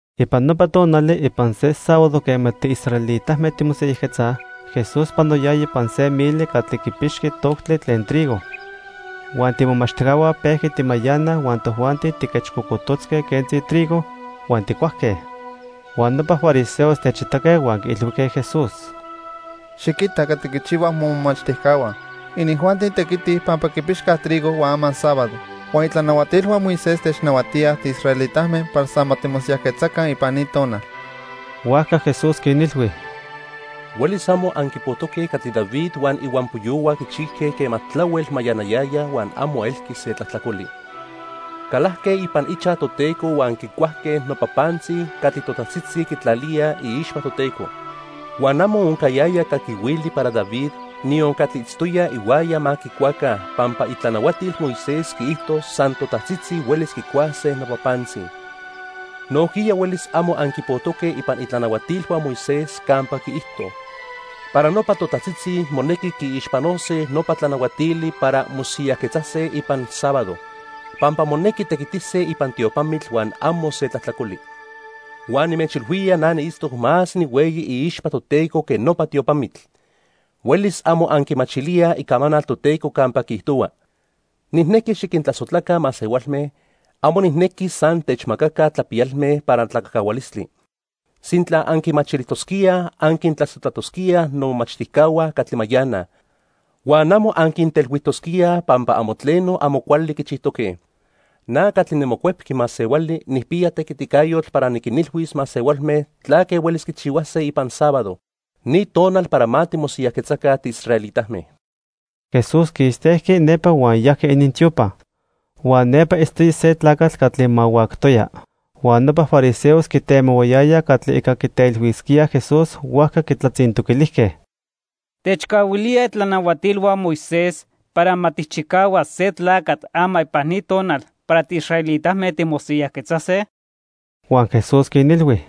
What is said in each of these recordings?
Ipan nopa tonali, ipan se sábado quema tiisraelitame timosiyajquetzaj, Jesús panoyaya ipan se mili catli quipixqui toctli tlen trigo. Huan tiimomachtijcahua pejqui timayanaj huan tojuanti tijquechcocototzque quentzi trigo huan tijcuajque. Huan nopa fariseos techitaque huan quiilhuijque Jesús: —Xiquita catli quichihuaj momomachtijcahua. Inijuanti tequitij, pampa quipixcaj trigo huan ama sábado. Huan itlanahuatilhua Moisés technahuatíaj tiisraelitame para san ma timosiyajquetzaca ipan ni tonal. Huajca Jesús quinilhui: —Huelis amo anquipojtoque catli David huan ihuampoyohua quichijque quema tlahuel mayanayayaj huan amo elqui se tlajtlacoli. Calajque ipan ichaj Toteco huan quicuajque nopa pantzi catli totajtzitzi quitlalíaj iixpa Toteco. Huan amo oncayaya caquihuili para David, niyon catli itztoyaj ihuaya ma quicuaca, pampa itlanahuatil Moisés quiijto san totajtzitzi huelis quicuase nopa pantzi. Nojquiya huelis amo anquipojtoque ipan itlanahuatilhua Moisés campa quiijto para nopa totajtzitzi monequi quiixpanose nopa tlanahuatili para mosiyajquetzase ipan sábado, pampa monequi tequitise ipan tiopamitl huan amo se tlajtlacoli. Huan nimechilhuía na niitztoc más nihueyi iixpa Toteco que nopa tiopamitl. Huelis amo anquimachilíaj Icamanal Toteco campa quiijtohua: 'Nijnequi xiquintlasojtlaca masehualme, amo nijnequi san techmacaca tlapiyalme para tlacajcahualistli.' Sintla anquimachilijtosquíaj, anquintlasojtlatosquíaj nomomachtijcahua catli mayanaj, huan amo anquintelhuijtosquíaj pampa amo tleno amo cuali quichijtoque. Na catli niMocuepqui Masehuali nijpiya tequiticayotl para niquinilhuis masehualme tlaque huelis quichihuase ipan sábado, ni tonal para ma timosiyajquetzaca tiisraelitame. Jesús quistejqui nepa huan yajqui inintiopa. Huan nepa itztoya se tlacatl catli mahuactoya. Huan nopa fariseos quitemohuayayaj catli ica quitelhuisquíaj Jesús, huajca quitlatzintoquilijque: —¿Techcahuilíaj itlanahuatilhua Moisés para ma tijchicahuas se tlacatl ama ipan ni tonal para tiisraelitame timosiyajquetzase? Huan Jesús quinilhui: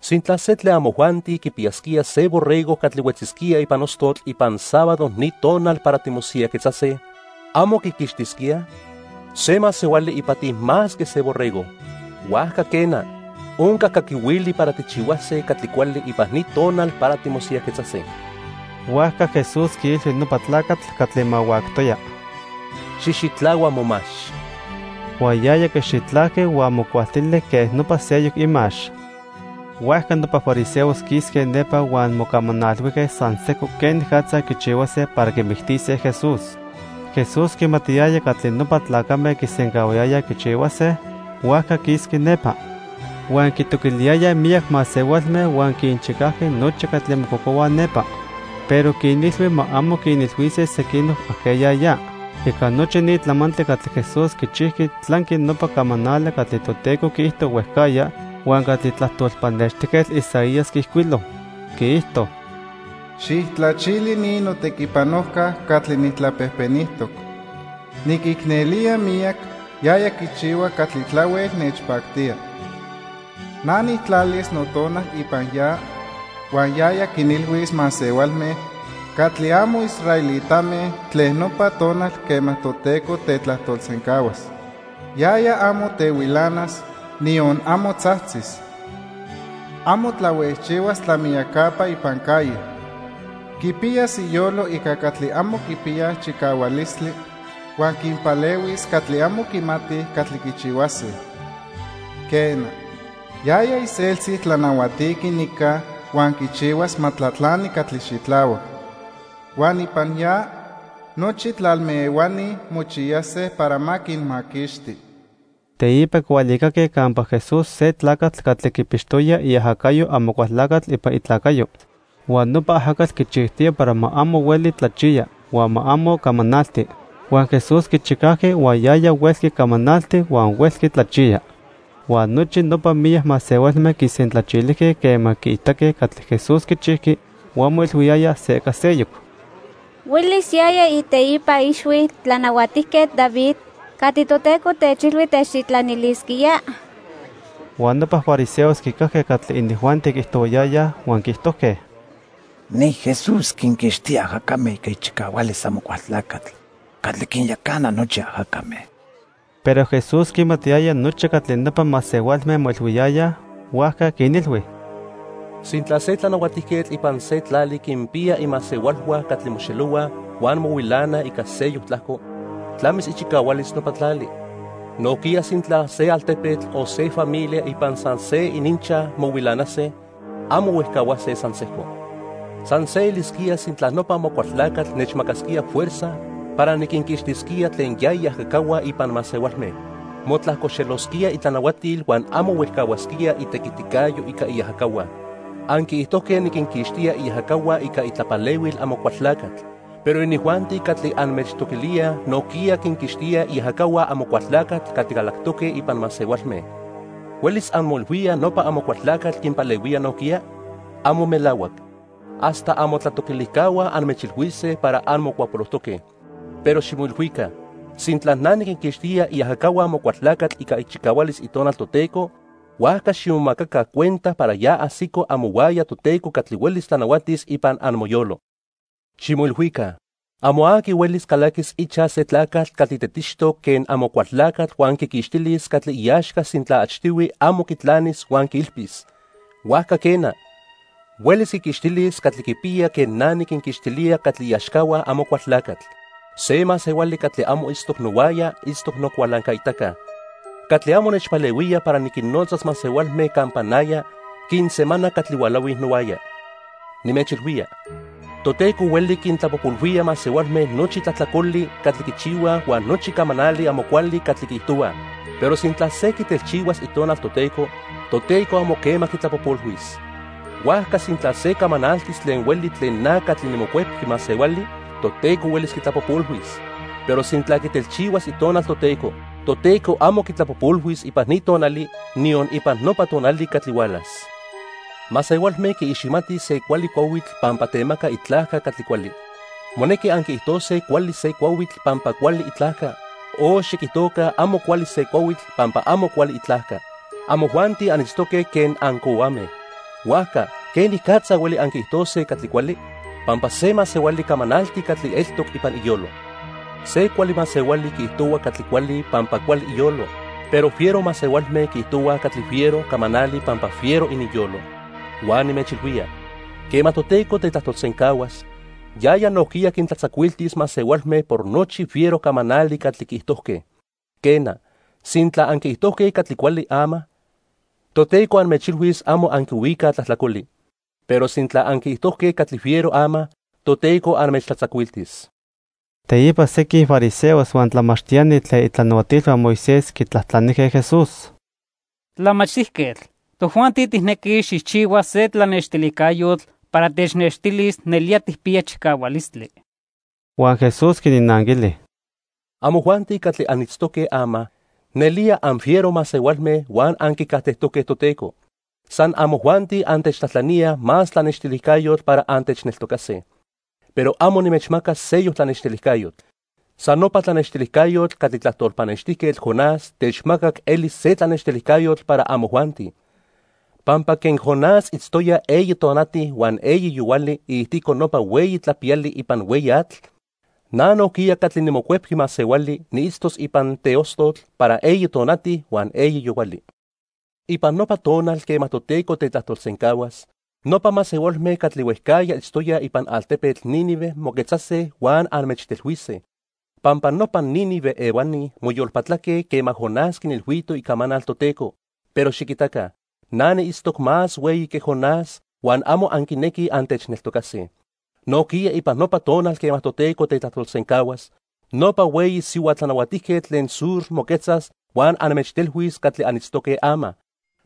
—Sintla se tlen amojuanti quipiyasquía se borrego catli huetzisquía ipan ostotl ipan sábado ni tonal para timosiyajquetzase, ¿amo quiquixtisquía? Se masehuali ipati más que se borrego. Huajca quena, onca caquihuili para tijchihuase catli cuali ipan ni tonal para timosiyajquetzase. Huajca Jesús quiilhui nopa tlacatl catli mahuactoya: —Xijxitlahua momax. Huan yaya quixitlajqui huan mocualtili quen nopa seyoc imax. Huajca nopa fariseos quisque nepa huan mocamanalhuijque san sejco quenicatza quichihuase para quimictise Jesús. Jesús quimatiyaya catli nopa tlacame quisencahuayayaj quichihuase, huajca quisqui nepa. Huan quitoquiliyayaj miyac masehualme, huan quinchicajqui nochi catli mococohuaj nepa. Pero quinilhui ma amo quinilhuise sequinoc ajqueya ya. Ica nochi ni tlamantli catli Jesús quichijqui tlanqui nopa camanali catli Toteco quiijto huejcajya huan catli tlajtol pannextijquetl Isaías quiijcuilo. Quiijto: "Xijtlachili ni notequipanojca catli nijtlapejpenijtoc. Niquicnelía miyac, yaya quichihua catli tlahuel nechpactía. Na nijtlalis Notonal ipan ya, huan yaya quinilhuis masehualme catli amo israelitame tlen nopa tonal quema Toteco tetlajtolsencahuas. Yaya amo tehuilanas, niyon amo tzajtzis. Amo tlahuejchihuas tlamiyacapa ipan calle. Quipiyas iyolo ica catli amo quipiyaj chicahualistli, huan quinpalehuis catli amo quimatij catli quichihuase. Quena, yaya iseltzi tlanahuatiqui nica huan quichihuas ma tlatlani catli xitlahuac. Huan ipan ya nochi tlalme ehuani mochiyase para ma quinmaquixti." Teipa quihualicaque campa Jesús se tlacatl catli quipixtoya iajacayo Amocualtlacatl ipan itlacayo. Huan nopa ajacatl quichijtoya para ma amo hueli tlachiya huan ma amo camanalti. Huan Jesús quichicajqui huan yaya huelqui camanalti huan huelqui tlachiya. Huan nochi nopa miyac masehualme quisentlachilijque quema quiitaque catli Jesús quichijqui huan moilhuiyayaj se ica seyoc: "¿Huelis yaya iteipa ixhui Tlanahuatijquetl David catli Toteco techilhui techtitlanilisquía?" Huan nopa fariseos quicajque catli inijuanti quiijtohuayayaj huan quiijtojque: "Ni Jesús quinquixtía ajacame ica ichicahualis Amocualtlacatl catli quinyacana nochi ajacame." Pero Jesús quimatiyaya nochi catli nopa masehualme moilhuiyayaj, huajca quinilhui: "Sintla se tlanahuatijquetl ipan se tlali quinpiya imasehualhua catli moxelohuaj huan mohuilanaj ica seyoc tlajco, tlamis ichicahualis nopa tlali. Nojquiya sintla se altepetl, o se familia ipan san se ininchaj mohuilanase, amo huejcahuase san sejco. San se elisquía sintla nopa Amocualtlacatl nechmacasquía fuerza para niquinquixtisquía tlen ya iajacahua ipan masehualme. Motlajcoxelosquía itlanahuatil huan amo huejcahuasquía itequiticayo ica iajacahua. Anquiijtojque niquinquixtía iajacahua ica itlapalehuil Amocualtlacatl, pero inijuanti catli anmechtoquilíaj nojquiya quinquixtíaj iajacahua Amocualtlacatl catli calactoque ipan masehualme. ¿Huelis anmoilhuíaj nopa Amocualtlacatl quinpalehuía nojquiya? ¡Amo melahuac! Hasta amotlatoquilijcahua anmechilhuise para anmocuapolojtoque. Pero ximoilhuica. Sintla na niquinquixtía iajacahua Amocualtlacatl ica ichicahualis Itonal Toteco, huajca ximomacaca cuenta para ya ajsico amohuaya Toteco catli huelis tlanahuatis ipan amoyolo. "Ximoilhuica, amo aqui huelis calaquis ichaj se tlacatl catli tetixtoc quen Amocualtlacatl huan quiquixtilis catli iaxca sintla achtihui amo quitlanis huan quiilpis. Huajca quena, huelis quiquixtilis catli quipiya quen na niquinquixtilía catli iaxcahua Amocualtlacatl. "Se masehuali catli amo itztoc nohuaya, itztoc nocualancaitaca. Catli amo nechpalehuía para niquinnotzas masehualme campa naya, quinsemana catli hualahuij nohuaya. "Nimechilhuía, Toteco hueli quintlapojpolhuía masehualme nochi tlajtlacoli catli quichihuaj huan nochi camanali amo cuali catli quiijtohuaj, pero sintla se quitelchihuas Itonal Toteco, Toteco amo quema quitlapojpolhuis. Huajca sintla se camanaltis tlen hueli tlen na catli niMocuepqui Masehuali, Toteco huelis quitlapojpolhuis, pero sintla quitelchihuas Itonal Toteco, Toteco amo quitlapojpolhuis ipan ni tonali, niyon ipan nopa tonali catli hualas. "Masehualme quiiximatij se cuali cuahuitl pampa temaca itlajca catli cuali. Monequi anquiijtose cuali se cuahuitl pampa cuali itlajca o xiquijtoca amo cuali se cuahuitl pampa amo cuali itlajca. Amojuanti anitztoque quen ancohuame, huajca ¿quenicatza hueli anquiijtose catli cuali? Pampa se masehuali camanalti catli eltoc ipan iyolo. Se cuali masehuali quiijtohua catli cuali pampa cuali iyolo, pero fiero masehualme quiijtohuaj catli fiero camanali pampa fiero ininyolo. Huan nimechilhuía, quema Toteco tetlajtolsencahuas, yaya nojquiya quintlatzacuiltis masehualme por nochi fiero camanali catli quiijtojque. Quena, sintla anquiijtojque catli cuali ama, Toteco anmechilhuis amo anquihuicaj tlajtlacoli. Pero sintla anquiijtojque catli fiero ama, Toteco anmechtlatzacuiltis." Teipa sequin fariseos huan tlamachtiani tlen itlanahuatilhua Moisés quitlajtlanijque Jesús: —Tlamachtijquetl, tojuanti tijnequij xijchihua se tlanextilijcayotl para technextilis nelía tijpiya chicahualistli. Huan Jesús quinnanquili: —Amojuanti catli anitztoque ama, nelía anfiero masehualme huan anquicajtejtoque Toteco. San amojuanti antechtlajtlaníaj más tlanextilijcayotl para antechneltocase. Pero amo nimechmacas seyoc tlanextilijcayotl. San nopa tlanextilijcayotl catli tlajtol pannextijquetl Jonás techmacac elis se tlanextilijcayotl para amojuanti. Pampa quen Jonás itztoya eyi tonati huan eyi yohuali iijtico nopa hueyi tlapiyali ipan hueyi atl, na nojquiya catli niMocuepqui Masehuali, niitztos ipan teostotl para eyi tonati huan eyi yohuali. Ipan nopa tonal quema Toteco tetlajtolsencahuas, nopa masehualme catli huejcajya itztoyaj ipan altepetl Nínive moquetzase huan anmechtelhuise. Pampa nopa Nínive ehuani moyolpatlaque quema Jonás quinilhuito icamanal Toteco, pero xiquitaca, na niitztoc más hueyi que Jonás huan amo anquinequij antechneltocase. Nojquiya ipan nopa tonal quema Toteco tetlajtolsencahuas, nopa hueyi sihua tlanahuatijquetl tlen Sur moquetzas huan anmechtelhuis catli anitztoque ama.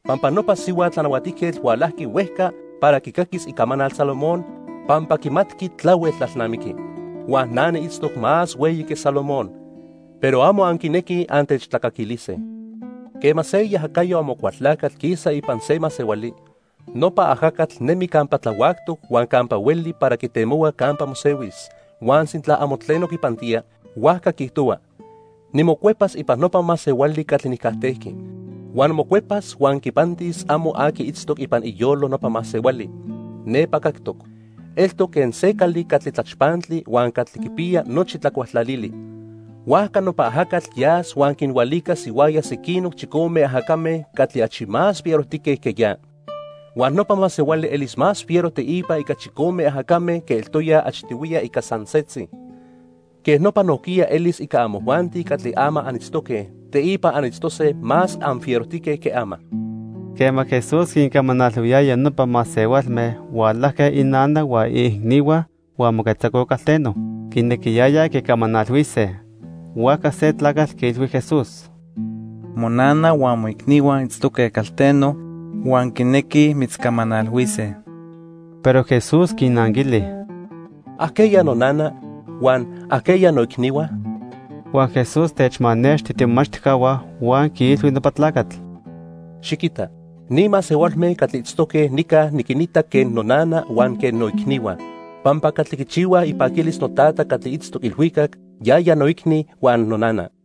Pampa nopa sihua tlanahuatijquetl hualajqui huejca para quicaquis icamanal Salomón pampa quimatqui tlahuel tlalnamiqui. Huan na niitztoc más hueyi que Salomón, pero amo anquinequij antechtlacaquilise. "Quema se iajacayo Amocualtlacatl quisa ipan se masehuali, nopa ajacatl nemi campa tlahuactoc huan campa hueli para quitemohua campa mosehuis, huan sintla amo tleno quipantía, huajca quiijtohua: 'Nimocuepas ipan nopa masehuali catli nijcajtejqui.' Huan mocuepas huan quipantis amo aqui itztoc ipan iyolo nopa masehuali. Nepa cactoc. Eltoc quen se cali catli tlachpantli huan catli quipiya nochi tlacualtlalili. Huajca nopa ajacatl yas huan quinhualicas ihuaya sequinoc chicome ajacame catli achi más anfierojtique que ya. Huan nopa masehuali elis más fiero teipa ica chicome ajacame que eltoya achtihuiya ica san setzi. Quej nopa nojquiya elis ica amojuanti catli ama anitztoque, teipa anitztose más anfierojtique que ama." Quema Jesús quincamanalhuiyaya nopa masehualme, hualajque inana huan iicnihua huan moquetzacoj calteno. Quinequiyayaj quicamanalhuise. Huajca se tlacatl quiilhui Jesús: —Monana huan moicnihua itztoque calteno huan quinequij mitzcamanalhuise. Pero Jesús quinanquili: —¿Ajqueya nonana?, huan ¿ajqueya noicnihua? Huan Jesús techmanexti tiimomachtijcahua huan quiilhui nopa tlacatl: —Xiquita, ni masehualme catli itztoque nica niquinita quen nonana huan quen noicnihua. Pampa catli quichihua ipaquilis noTata catli itztoc ilhuicac, yaya noicni huan nonana.